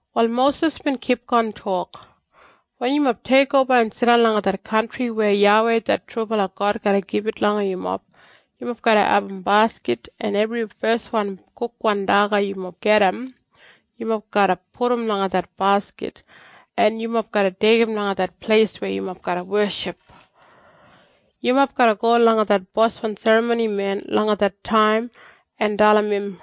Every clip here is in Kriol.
Wal Mosis bin kipgon tok, “Wen yumob teikoba en jidan langa det kantri weya YAWEI det trubala God garra gibit langa yumob, yumob garra abum baskit, en ebri feswan kukwan daga yumob gajim, yumob garra pudum langa det baskit, en yumob garra deigim langa det pleis weya yumob garra weship. Yumob garra go langa det boswan serramonimen langa det taim en dalim im,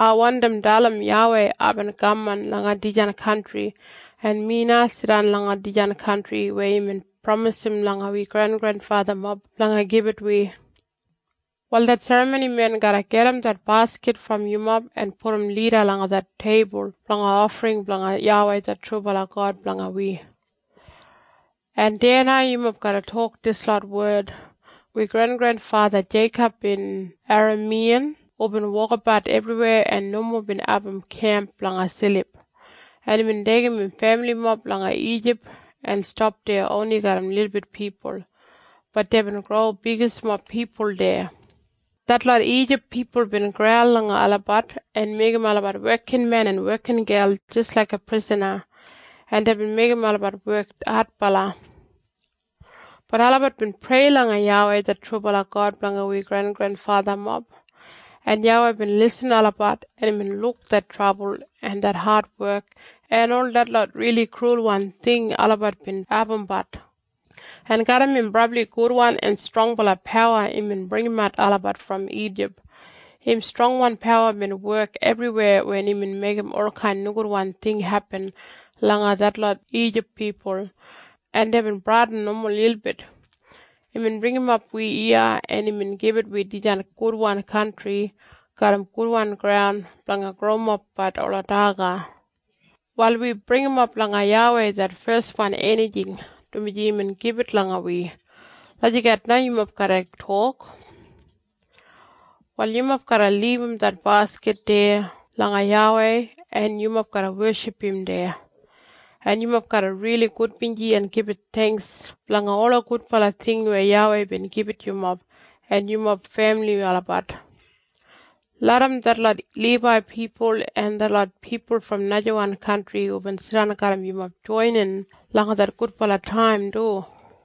‘Ai wandim dalim YAWEI aibin kaman langa dijan kantri en mi na jidan langa dijan kantri weya imbin pramisim langa wi grengrenfathamob blanga gibit wi.’ “Wal det serramonimen garra gajim det baskit brom yumob en pudum lida langa det teibul blanga ofring blanga YAWEI det trubala God blanga wi. En deya na yumob garra tok dislot wed, ‘Wi grengrenfatha Jeikob bin Eramiyan hubin wokabat ebriweya en nomo bin abum kemp blanga silip, en imbin deigim im femilimob langa Ijip en stap deya oni garram lilbit pipul, bat deibin gro bigismob pipul deya. Detlot Ijip pipul bin graul langa olabat en meigim olabat wekinmen en wekingel jis laiga prisana, en deibin meigim olabat wek adbala. Bat olabat bin prei langa YAWEI det trubala God blanga wi grengrenfathamob. En YAWEI bin irrim olabat en imbin luk det trabul en det adwek en ol detlot rili krulwan ting olabat bin abumbat. En garram im brabli gudwan en strongbala pawa imbin bringimat olabat brom Ijip. Im strongwan pawa bin wek ebriweya wen imbin meigim olkain nogudwan ting hepin langa detlot Ijip pipul, en deibin bradin nomo lilbit. Imbin bringimap wi iya en imbin gibit wi dijan gudwan kantri garram gudwan graun blanga growimapbat ola daga. Wal wi bringimap langa YAWEI det feswan enijing, dumaji imbin gibit langa wi.’ Lagijat na yumob garra tok. “Wal yumob garra libum det baskit deya langa YAWEI en yumob garra weship im deya. En yumob garra rili gudbinji en gibit theingks blanga ola gudbala ting weya YAWEI bin gibit yumob en yumob femili olabat. Larram detlot Libai pipul en detlot pipul brom najawan kantri hubin jidan garram yumob joinin langa det gudbala taim du.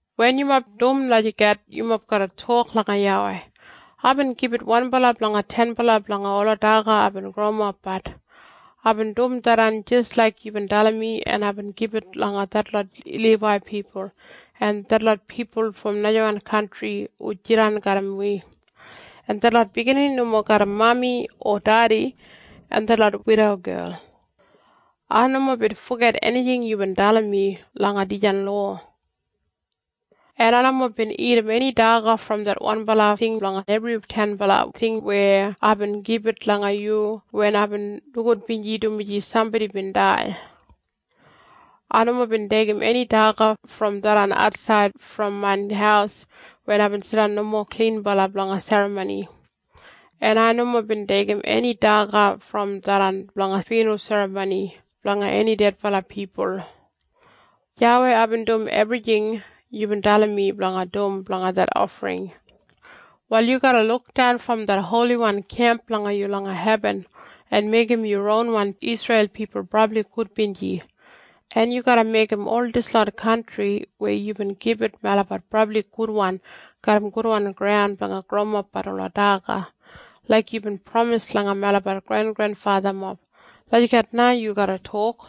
Wen yumob dum lagijat yumob garra tok langa YAWEI, ‘Aibin gibit wanbala blanga tenbala blanga ola daga aibin growimapbat. Aibin dum tharran jis laik yubin dalim mi en aibin gibit langa detlot Libai pipul, en detlot pipul brom najawan kantri hu jidan garram wi, en detlot biginini nomo garram mami o dedi, en detlot widogel. Ai nomo bin foget enijing yubin dalim mi langa dijan lowa. “‘En ai nomo bin dagat eni daga brom det wanbala ting blanga ebri tenbala ting weya aibin gibit langa yu wen aibin nogudbinji dumaji sambodi bin dai. Ai nomo bin deigim eni daga brom tharran atsaid brom main haus wen aibin jidan nomo klinbala blanga serramoni, en ai nomo bin deigim eni daga brom tharran blanga fyunral serramoni blanga eni dedbala pipul. YAWEI aibin dum ebrijing yubin dalim mi blanga dum blanga det ofring. Wal yu garra lukdan brom det holiwan kemp blanga yu langa hebin, en meigim yu ronwan Isreil pipul brabli gudbinji. En yu garra meigim ol dislot kantri weya yubin gibit melabat brabli gudwan garram gudwan graun blanga growimapbat ola daga, laik yubin pramis langa melabat grengrenfathamob.’ Lagijat na yu garra tok.”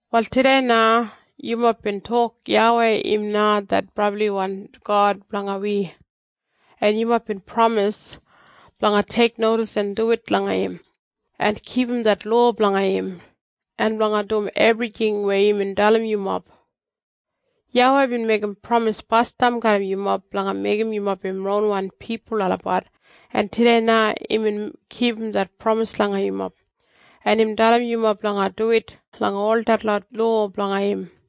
Wal tudei na yumob bin tok YAWEI im na det brabliwan God blanga wi, en yumob bin pramis blanga teiknodis en duwit langa im, en kipum det lowa blanga im, en blanga dum ebrijing weya imbin dalim yumob. YAWEI bin meigim pramis basdam garram yumob blanga meigim yumob im ronwan pipul olabat, en tudei na imbin kipum det pramis langa yumob. En imbin dalim yumob blanga duwit langa ol detlot lowa blanga im.